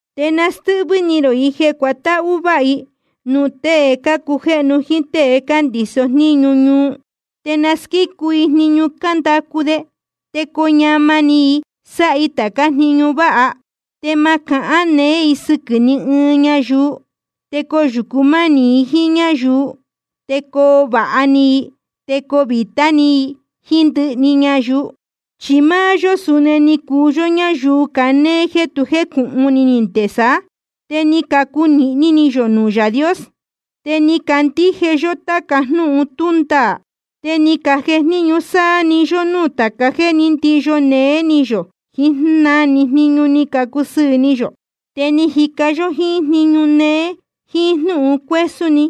Te na nástɨ́hvɨ́ ni rō i jeē cuatáhú váha i nuū tēe cácujéhnu jíín tée cándiso jníñu ñuu. Te na squícu i jniñu cándacu de, te coo ñamā ni i sáha i tācá jniñu váha. Te ma cahán neé i sɨquɨ̄ ni ɨɨn ñayuu, te coyūcu mánī i jíín ñáyuu, te coo vāha ni i, te coo vītá ni i jíín ndɨhɨ ñayuu. Chi máá yó suni ni cuu yó ñáyuu canéé jeē tu jécūhun ni nde saá, te ni cacunīhni ni yō nuū Yaā Dios. Te ni cacandíje yó táca jnúhun tú ndaā, te ni cajejníñu sáá‑ni yó núū tāca jéē ní ndiyo néé ni yō jiín na‑ni jniñu ni cusɨɨ̄ ni yō. Te ni cajica yó jíín jniñu néé jíín jnúhun cuésún ni.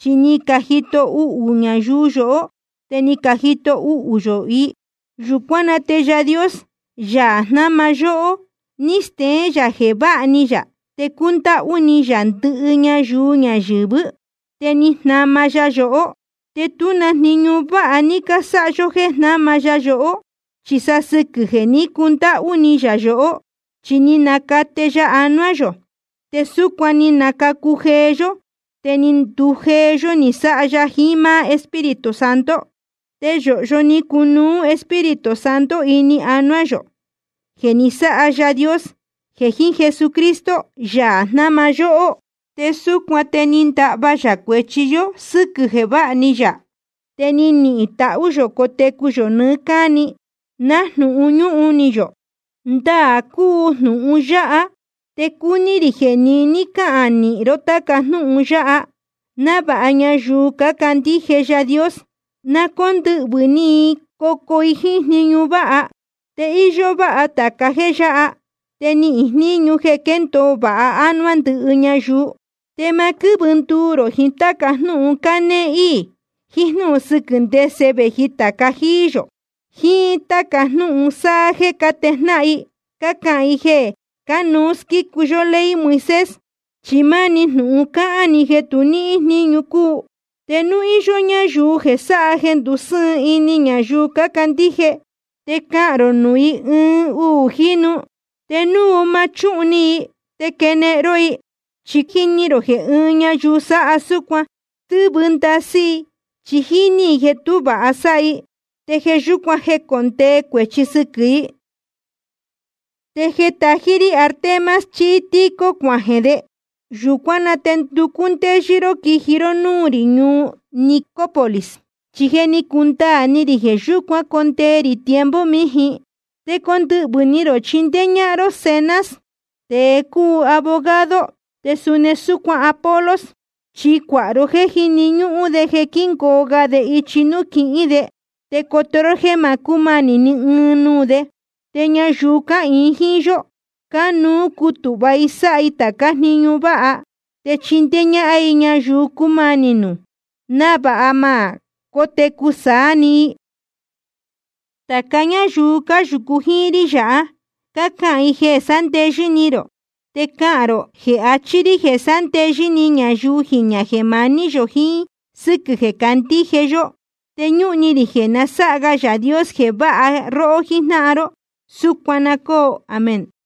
Chi ni cajito uhū ñayuu yohó, te ni cajito uhū yō i. Yūcuán na te Yaā Dios, Yaā jnáma yóhó, ní steén yā jeē váha ni yā te cúndáhú ni yā ndɨhɨ ñayuu ñayɨ̄vɨ́. Te ni jnama ya yohó, te tú na jniñu váha ní cásáha yó jéē jnáma ya yohó, chi sa sɨquɨ̄ jeē ní cundáhú ni yā yohó. Chi ni nacate ya anuá yō, te súcuan ni nacacu jeé yó, te ni ndujeé yó ni sáha ya jiín máá Espíritu Santo. Te yōhyo ni cunuú Espíritu Santo ini anuá yō, jeē ni sáha Yaā Dios jeē jiín Jesucristo, Yaā jnáma yóhó. Te súcuan te ni ndahva yā cuēchi yó sɨ́quɨ̄ jeē váha ni yā, te nihīn tahú yō cotecu yō nɨɨ́ cáni, nájnūhun ñúhun ni yō. Ndaā cúu jnūhun yáha, te cúní rī jeē niní cáhān nīhin ro táca jnúhun yáha, návāha ñayuu cácandíje Yaā Dios, na cóndɨhvɨ̄ ni i cocuu i jíín jniñu váha. Chi íyó váha tāca jéē yáha, te níhín jníñu jeē quéndōo vāha ánuá ndɨhɨ ñayuu. Te ma quɨ́vɨ nduu rō jiín táca jnúhun cánéé íī, jiín jnúhun sɨquɨ̄ ndese vēji tāca jíí yō, jíín táca jnúhun sáha jeē cátejnáhan i cácahān i jeē cánuú squícu yó ley Moisés. Chi máni jnūhun cāhá‑ni jeē tu níhín jníñu cúu. Te núu íyó ñáyuu jeē sáha jeē ndusɨ́ɨn ini ñayuu cácandíje, te cahān rō nuū i ɨɨn uū jínu, te núu ma chúhun ni i, te quenehen ró i. Chi jíní rō jeē ɨɨn ñayuu sáha súcuan, stɨ́vɨ ndasɨ́ i chi jíní i jeē tú vāha sáha i, te jeē yúcuan jécondee cuēchi sɨquɨ̄ i. Te jeē tají rí Artemas chí Tíquico cuajeē de, yūcuán na te nducú ndéyɨ́ ró quiji ró núū rī ñuu Nicópolis, chi je ni cundaā ni rī jeē yúcuan condee rī tiempo mījin. Te condɨhvɨ̄ ni rō chindéé ñáhán ró Zenas, tēe cúu abogado, te suni súcuan Apolos. Chi cuāha ró jéē jíni ñúhún de jeē quíngoo ga de ichi nuū quihín de. Te coto ró jéē ma cúmanī ni ɨɨn nuū de. Te ñayuu cáhīin jíín yó, cánuú cutūhva i sáha i tācá jniñu váha, te chindéé ñáhán i ñayuu cúmanī nuū, návāha ma cótecu saá‑ni i. Tāca ñáyuu cáyūcu jíín rí yáha, cácahān i jeē sándeyɨ́ ni rō. Te cahān rō jeē achí rí jeē sándeyɨ́ ni ñayuu jiñā jeē maní yō jiín sɨ́quɨ̄ jeē cácandíje yó. Te ñúhun ni rī jeē na sáha ga Yaā Dios jeē váha róhó jíjnáhan ró. Súcuan na cóo. Amén.